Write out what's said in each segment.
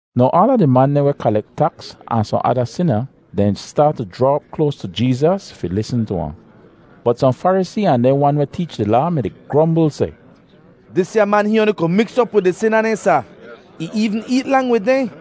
Now aala di man dehn weh kalek taks ahn sohn ada sina dehn staat tu jraa op kloas tu Jeezas fi lisn tu ahn. Bot sohn Farisee ahn dehn wan weh teech di Laa mi-di grombl seh, “Disya man hihn oanli ku miks op wid di sina dehn, sa. Ih eevn eet lang wid dehn.”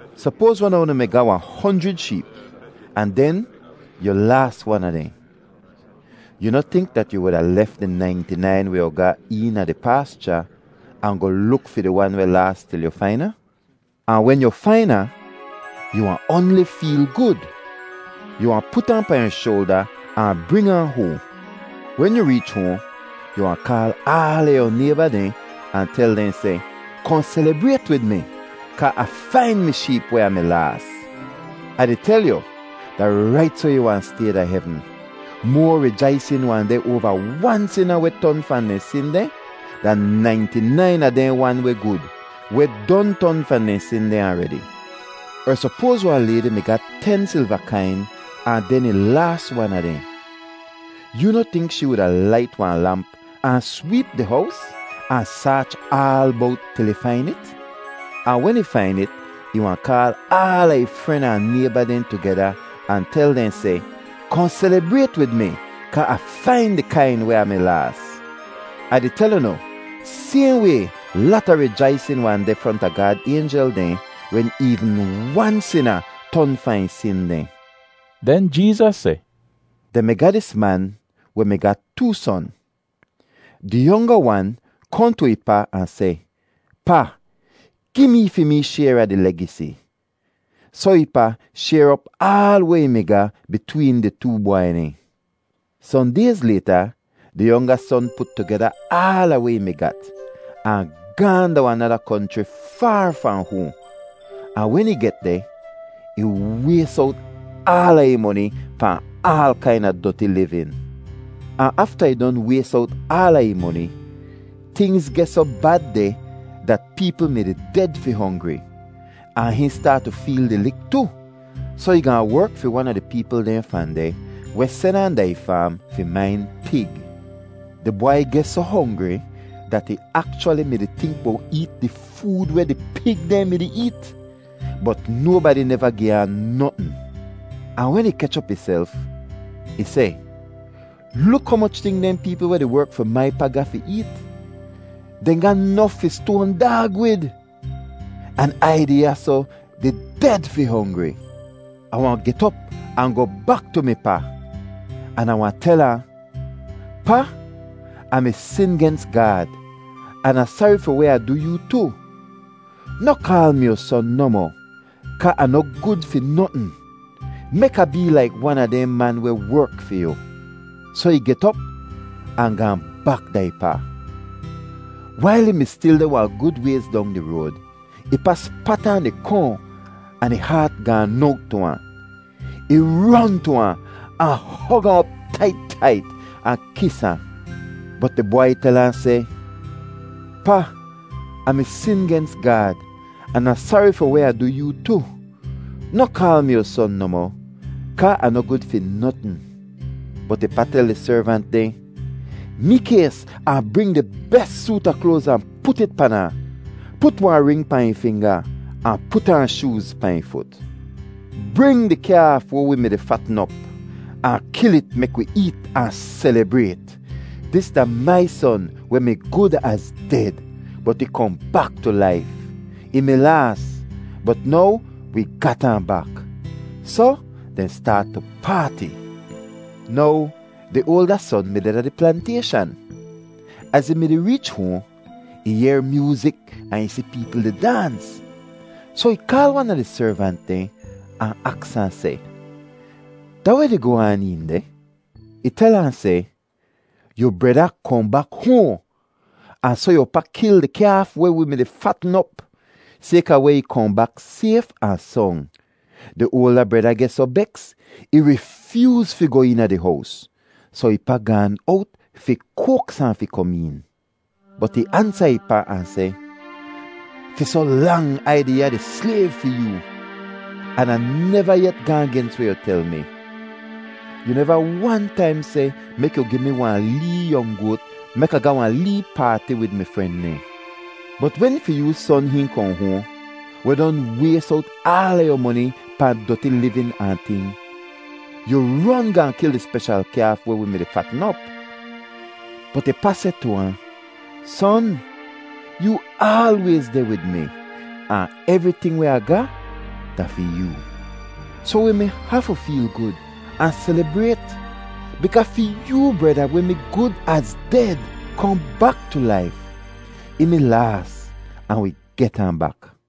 “Sopoaz wan a unu mi ga wahn honjrid sheep ahn den yu laas wan a dehn. Yu noh tink dat yu wuda lef di nainti-nain weh yu ga eena di paascha ahn goh luk fi di wan weh laas til yu fain ahn? Ahn wen yu fain ahn, yu wahn oanli feel gud! Yu wahn put ahn pahn yu shoalda ahn bring ahn hoahn. Wen yu reech hoahn, yu wahn kaal aala yu nayba dehn ahn tel dehn seh, ‘Kohn selibrayt wid mi kaa Ah fain mi sheep weh Ah mi laas.’ Ah di tel yu, da rait soh ih wahn stay da hevn; moa rijaisin wahn deh oava wan sina weh ton fahn dehn sin dehn, dan nainti-nain a dehn wan weh gud, weh don ton fahn dehn sin dehn aredi. “Er sopoaz wahn laydi mi ga ten silva kain ahn den ih laas wan a dehn. Yoo noh tink shee wuda lait wahn lamp ahn sweep di hows, ahn saach aal bowt til ih fain it? Ahn wen ih fain it, ih wahn kaal aala ih fren ahn nayba dehn tugeda ahn tel dehn seh, ‘Kohn selibrayt wid mi kaa Ah fain di kain weh Ah mi laas.’ Ah di tel unu, sayhn way lata rijaisin wahn deh fronta Gaad aynjel dehn wen eevn wan sina ton fahn ih sin dehn.” Den Jeezas seh, “Dehn mi ga dis man weh mi ga too son. Di yonga wan kohn tu ih pa ahn seh, ‘Pa, gi mee fi mee shayr a di legisi.’ Soh ih pa shayr op aal weh ih mi ga bitween di too bwai dehn. “Sohn dayz layta, di yonga son put tugeda aala weh ih mi gat, ahn gaahn da wahn nada konchri faar fahn hoahn, ahn wen ih get deh, ih ways owt aala ih moni pahn aal kaina doti livin. Ahn afta ih don ways owt aala ih moni, tingz geh soh bad deh dat peepl mi-di ded fi hongri, ahn hihn staat tu feel di lik tu. Soh ih gaahn werk fi wan a di peepl dehn fahn deh weh sen ahn da ih faam fi main pig. Di bwai geh soh hongri dat ih akchwali mi-di tink bowt eet di food weh di pig dehn mi-di eet, bot nobadi neva gi ahn notn. “Ahn wen ih kech op ihself, ih seh, ‘Luk humoch ting dehn peepl weh di werk fi mai pa ga fi eet. Dehn ga nof fi stoan daag wid, an Ai deh ya soh di ded fi hongri. Ah wahn get op ahn goh bak tu mi pa, an Ah wahn tel ahn: Pa, Ah mi sin gens Gaad an Ah sari fi weh Ah du yoo tu. Noh kaal mi yu son nohmoh kaa Ah noh gud fi notn. Mek Ah bee laik wan a dehn man weh werk fi yu.’ Soh ih get op ahn gaahn bak da ih pa. “Wail ih mi stil deh wahn gud wayz dong di road, ih pa spat ahn di kohn ahn ih haat gaan owt tu ahn. Ih ron tu ahn, ahn hog ahn op tait tait, ahn kis ahn. “Bot di bwai tel ahn seh, ‘Pa, Ah mi sin gens Gaad an Ah sari fi weh Ah du yoo tu. Noh kaal mi yu son nohmoh kaa Ah noh gud fi notn.’ “Bot ih pa tel di servant dehn, ‘Mikays ahn bring di bes soot a kloaz ahn put it pan ahn. Put wahn ring pahn ih finga ahn put aan shooz pahn ih fut. Bring di kyaaf weh wi mi-di fatn op, ahn kil it mek wi eet ahn selibrayt. Dis da mai son weh mi gud az ded, bot ih kohn bak tu laif. Ih mi laas, bot now wi gat ahn bak.’ Soh dehn staat tu paati. “Now di oalda son mi deh da di plantayshan. Az ih mi-di reech hoahn, ih yehr myoozik ahn ih si peepl di daans. Soh ih kaal wan a di servant dehn ahn aks ahn seh, ‘Da weh di goh aan een deh?’ Ih tel ahn seh, ‘Yu breda kohn bak hoahn, ahn soh yu pa kil di kyaaf weh wi mi-di fatn op, sayka weh ih kohn bak sayf ahn song.’ “Di oalda breda geh soh beks, ih rifyooz fi goh eena di hows. Soh ih pa gaan owt fi koaks ahn fi kom een. Bot ih ansa ih pa ahn seh, ‘Fi soh lang Ai deh ya di slayv fi yoo, an Ah neva yet gaahn gens weh yu tel mi. Yu neva wan taim seh mek yu gi mi wahn lee yong goat mek Ah ga wahn lee paati wid mi fren dehn. Bot wen fi yoo son hihn kohn hoahn, weh don ways owt aala yu moni pahn doti livin ahn ting, yu ron gaahn kil di speshal kyaaf weh wi mi-di fatn op!’ “Bot ih pa seh tu ahn, ‘Son, yoo aalwayz deh wid mi, ahn evriting weh Ah ga da fi yoo. Soh wi mi hafu feel gud ahn selibrayt bikaa fi yoo breda weh mi gud az ded kohn bak tu laif. Ih mi laas ahn wi get ahn bak.’”